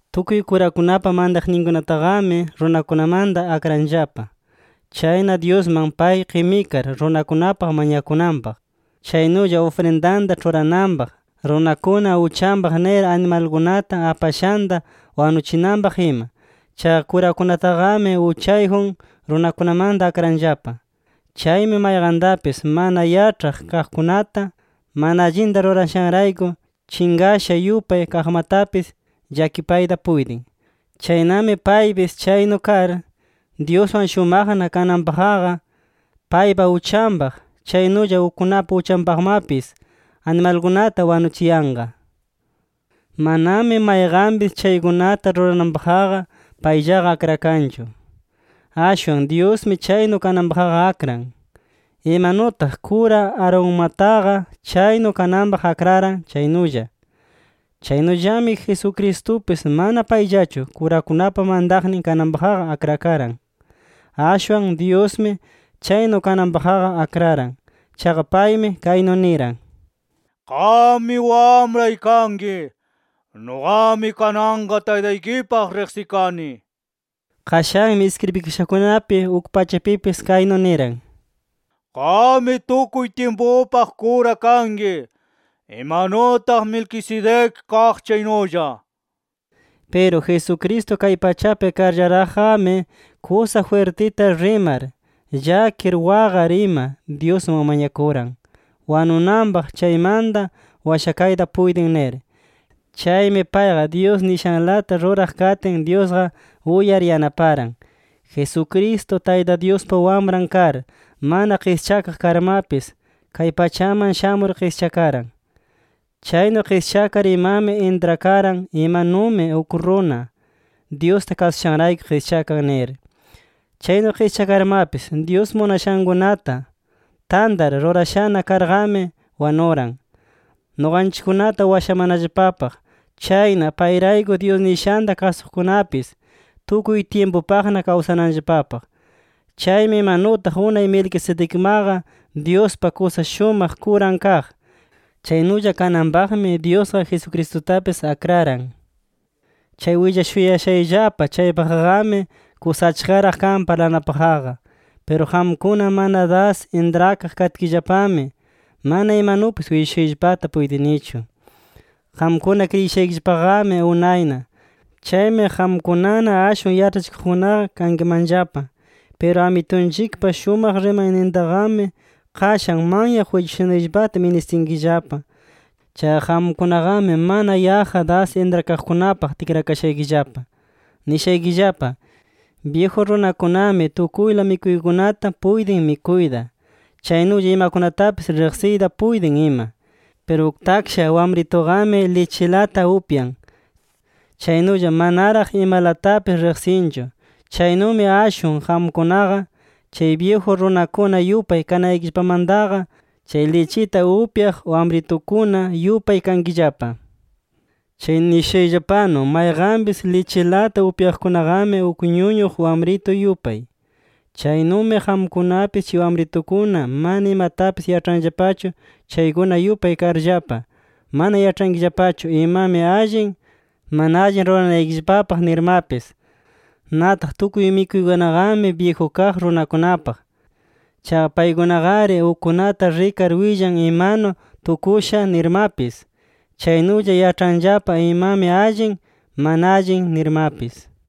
Tukuy kurakunapa mantaqninkunataqami, runakunamanta akranllapa. Chayna Dyusman pay qimikar runakunapaq mañakunanpaq, chaynulla ufrindanta ĉhurananpaq, runakuna uchanpaq nir animalkunata apashanta wanuchinanpaq ima. Chaqa kurakunataqami, uchayjun runakunamanta akranllapa. Chaymi mayqantapis mana yaĉhaq kaqkunata, mana allinta rurashanrayku chinqasha yupay kaqmatapis, llakipayta puytin. Chaynami paypis chaynu kar, Dyuswan shumaqna kananpaqqa, paypa uchanpaq, chaynulla ukkunapa uchanpaqmapis, animalkunata wanuchiyanqa. Manami mayqanpis chaykunata rurananpaqqa payllaqa akrakanchu. Ashwan Dyusmi chaynu kananpaqqa akran, imanutaq kura Aaronmataqa chaynu kananpaq akraran chaynulla. Chaynullami, Jesucristupis mana payllachu kurakunapa mantaqnin kananpaqqa akrakaran. Ashwan Dyusmi chaynu kananpaqqa akraran. Chaqa paymi kaynu niran: “Qammi Wamray kanki. Nuqami kananqa Taytaykipaq riqsikani” nir. Qashanmi iskribikashakunapi uk pachapipis, kaynu niran: “Qammi tukuy tyimpupaq kura kanki, imanutaq Melquisedec kaq chaynulla” nir. Piru Jesucristo kay pachapi karllaraqqami, kusa jwirtita rimar, llakir waqar ima Dyusman mañakuran, wanunanpaq chaymanta washayta puytin nir. Chaymi payqa Dyus nishanlata ruraq katin, Dyusqa uyar yanaparan. Jesucristo, Tayta Dyuspa Wamran kar, mana qischakaq karmapis kay pachaman shamur qischakaran. Chaynu qischakar imami intrakaran imanumi uk runa, Dyusta kasushanrayku qischakan nir. Chaynu qischakarmapis Dyus munashankunata tantar rurashana karqami, wanuran nuqanchikkunata washamanallapapaq. Chayna payrayku Dyus nishanta kasuqkunapis, tukuy tyimpupaqna kawsananllapapaq. Chaymi imanutaq unay Melquisedecmaqa Dyuspa kusa shumaq kuran kaq, chaynulla kananpaqmi Dyusqa Jesucristutapis akraran. Chay willashuyashayllapa chaypaqqami, kusa achkaraq kan parlanapaqqa. Piru qamkuna mana das intrakaq katkillapami mana imanupis willashuyllapata puytinichu. Qamkuna kriyishaykillapaqami unayna. Chaymi qamkunana ashwan yaĉhachikuqkunaqa kankimanllapa. Piru Amitunchikpa shumaq rimaynintaqami, qashan manyaq willashunanllapata ministinkillapa. Chaqa qamkunaqami mana yaqqa das intrakaqkunapaq tikrakashaykillapa. Nishaykillapa: Byiju runakunami tukuyla mikuykunata puytin mikuyta, chaynulla imakunatapis riqsiyta puytin ima. Piru uk taksha wamrituqami, lichilata upyan, chaynulla manaraq imalatapis riqsinchu. Chaynumi ashwan qamkunaqa, chay byiju runakuna yupay kanaykillapamantaqa, chay lichita upyaq wamritukuna yupay kankillapa. Chay nishushayllapanu, mayqanpis lichilata upyaqkunaqami, uk ñuñuq wamritu yupay. Chaynumi qamkunapis chay wamritukuna mana imatapis yaĉhanllapachu chaykuna yupay karllapa, mana yaĉhankillapachu imami allin, mana allin ruranaykillapapaq nirmapis. Nataq tukuy mikuykunaqami, byiju kaq runakunapaq. Chaqa paykunaqari ukkunata rikar willan imanu tukusha nirmapis. Chaynulla yaĉhanllapa imami allin, mana allin nirmapis.